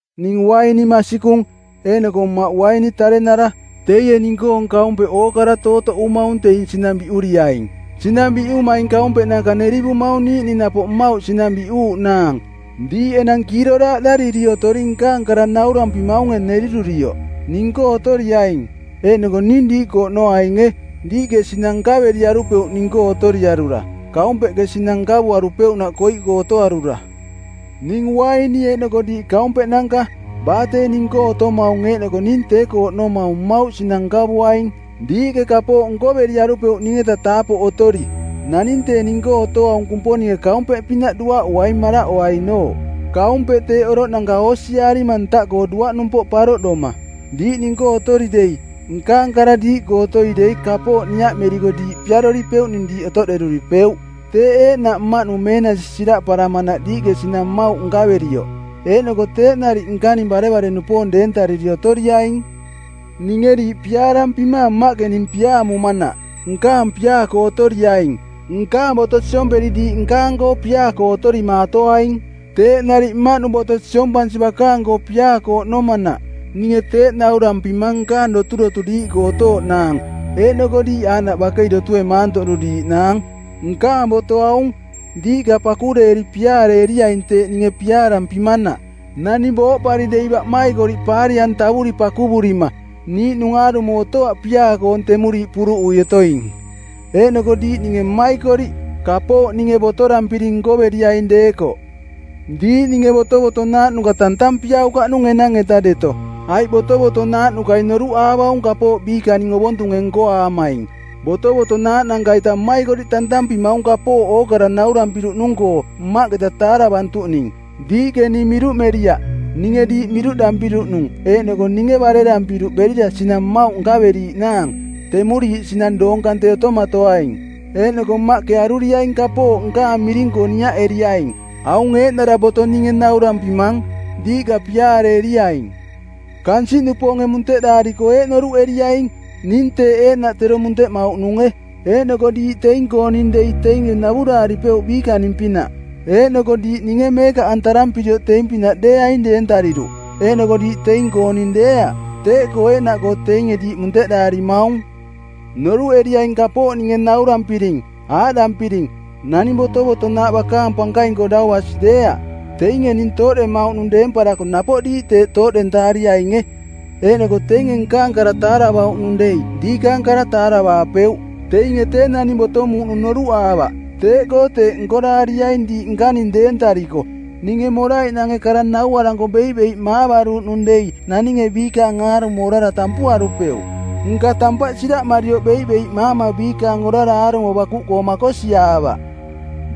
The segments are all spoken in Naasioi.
“Ning uaini masikung, eeꞌnoko Mmaꞌ uaini tarenara. Teie ning-koong kaumpeꞌ ookara tootoꞌumaung teing sinang biꞌuriaing. Sinang biꞌumaing kaumpeꞌnanka nerivumaung niiꞌning napoꞌ mmauꞌ sinang biꞌuuꞌnaang. Diiꞌ enang kiiroraaꞌdariri otoring nkaang kara naurampimaunge nerirurioꞌ. Ning-koo otoriaing, eeꞌnoko ning diiꞌkoo oꞌnoainge. Diiꞌke sinang nkaveriarupeuꞌ ning-koo otoriarura, kaumpeꞌke sinang nkavuarupeuꞌnaꞌ koiꞌkoo otoarura. “Ning uaini eeꞌnoko diiꞌ kaumpeꞌnanka. Baa tee ning-koo otomaung eeꞌnoko ning tee-koo oꞌnomaung mmauꞌ sinang nkavuaing. Diiꞌke kapooꞌ nkoveriarupeuꞌ ning-eta taapoꞌ otori. Naning tee ning-koo otoaung Kumponinge kaumpeꞌpinaꞌ duaꞌuaing, maraꞌoainooꞌ. Kaumpeꞌ teeꞌ oroꞌnanka oosiaarima ntaꞌkoo duaꞌnumpoꞌ paroꞌdoma. Diiꞌ ning-koo otori dei, nkaang kara diiꞌkoo otoi dei kapooꞌ niaꞌmeriko diiꞌ piaroripeuꞌning diiꞌ otoꞌderuripeuꞌ. Teeꞌ eeꞌnaꞌ Mmaꞌnung meenasi siraꞌparamanaꞌ diiꞌke sinang mmauꞌ nkaverioꞌ. Eeꞌnoko teeꞌ nariꞌ nkaning barevare-nupoong deentariri otoriaing. Ninge diiꞌ piaarampimaang Mmaꞌke ning piaamumanaꞌ. Nkaang piaa-koo otoriaing. Nkaang boto siomperi diiꞌ nkaang-koo piaa-koo otorimaatoaing. Teeꞌ nariꞌ Mmaꞌnung boto siompansi bakaang-koo piaa-koo oꞌnomanaꞌ. “Ninge teeꞌ naurampimang nkaang doturotu diiꞌkoo otooꞌnaang, eeꞌnoko diiꞌ aaꞌnaꞌ bakei dotue maantoꞌduriiꞌnaang. Nkaang boto aung, ‘Diiꞌka pakureeri piaareeriaing teeꞌ ninge piaarampimanaꞌ.’ Naning booꞌpari dei baꞌmaikoriꞌ paari-antavuri pakuvurima, niiꞌnung aarumo otoaꞌ piaa-koong temuriiꞌ puruꞌui otoing. Eeꞌnoko diiꞌ ninge mmaikoriꞌ, kapooꞌ ninge botorampiring nkoveriaing deekoꞌ. Diiꞌ ninge botovotonaaꞌnuka tantampiaukaꞌnung enang-eta deto, aiꞌ botovotonaaꞌnukai noruꞌaavaung kapooꞌ biikaning ovontunge nkoaamaing. Botovotonaaꞌnanka-ita mmaikoriꞌ tantampimaung kapooꞌ ookara naurampiruꞌnung-koo Mmaꞌketa taaravantuꞌning. Diiꞌke ning miruꞌmeriaꞌ, ninge diiꞌ miruꞌdampiruꞌnung eeꞌnoko ninge barerampiruꞌ berira sinang mmauꞌ nkaveriiꞌnaang, temuriiꞌ sinang doong kante otomatoaing. Eeꞌnoko Mmaꞌke aruriaing kapooꞌ nkaang miring-koo niaꞌeriaing. Aung eeꞌnara boto ninge naurampimang, ‘Diiꞌka piaareeriaing.’” “Kansiꞌnupoonge munteꞌdaariko eeꞌ noruꞌeriaing, ning teeꞌ eeꞌnaꞌ tero munteꞌmauꞌnunge. Eeꞌnoko diiꞌ teing-kooning dei teinge navuraaripeuꞌ biikaning-pinaꞌ. Eeꞌnoko diiꞌ ninge meekaꞌantarampirioꞌ teing-pinaꞌ deeaing deentariruꞌ, eeꞌnoko diiꞌ teing-kooning deeaꞌ. Teeꞌkoo eeꞌnaꞌkoo teinge diiꞌ munteꞌdaarimaung. Noruꞌeriaing kapooꞌ ninge naurampiring, aaꞌdampiring, ‘Naning botovotonaaꞌ bakaang pankaing-koo dau basi deeaꞌ.’ Teinge ning tooꞌdemauꞌnung deemparako napoꞌ diiꞌ teeꞌ tooꞌdentaariainge. Eeꞌnoko teinge nkaang kara taaravauꞌnung dei diikaang kara taaravaapeuꞌ. Teinge tee naning botomuuꞌnung noruꞌaavaꞌ, teeꞌkoo teeꞌ nkoraariaing diiꞌ nkaning deentariko. Ninge moraiꞌnange kara nauaranko beiꞌbeiꞌmaavaruꞌnung dei naninge biikaang aarumo orara tampuarupeuꞌ. Nka tampaꞌ siraꞌmarioꞌ beiꞌbeiꞌmaama biikaang orara aarumo bakuꞌkoo makosiaavaꞌ.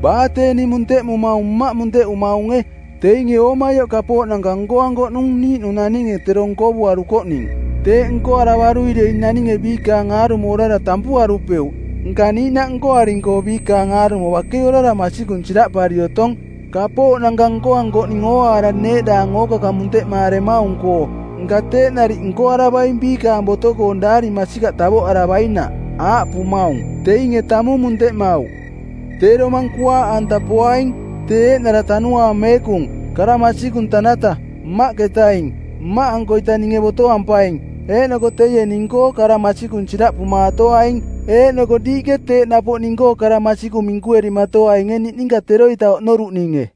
Baa tee ning munteꞌmumaung Mmaꞌ munteꞌumaunge. Teinge oomaioꞌ kapooꞌnanka nkoankoꞌnung niiꞌnung naninge tero nkovuarukoꞌning. Teeꞌ nkoaravarui dei naninge biikaang aarumo orara tampuarupeuꞌ. Nka niiꞌnaꞌ nkoaring-koo biikaang aarumo bakei orara masikung siraꞌpari otong, kapooꞌnanka nkoankoꞌning ooaara neeꞌdaang ookakang munteꞌmaaremaung-koo. Nka teeꞌ nariꞌ nkoaravaing biikaang boto-koong daari masikaꞌ tavoꞌaravainaꞌ, aaꞌpumaung, ‘Teinge tamung munteꞌmauꞌ.’ “Tee Domang Kuaaꞌanta poaing. Tee eeꞌnara Tanuaang Meekung, kara masikung tanata, Mmaꞌketaing. Mmaꞌankoita ninge botoampaing, eeꞌnoko teie ning-koo kara masikung siraꞌpumaatoaing. Eeꞌnoko diiꞌke teeꞌ napoꞌ ning-koo kara masikung minkuerimatoainge niꞌninka teroita oꞌnoruꞌninge.”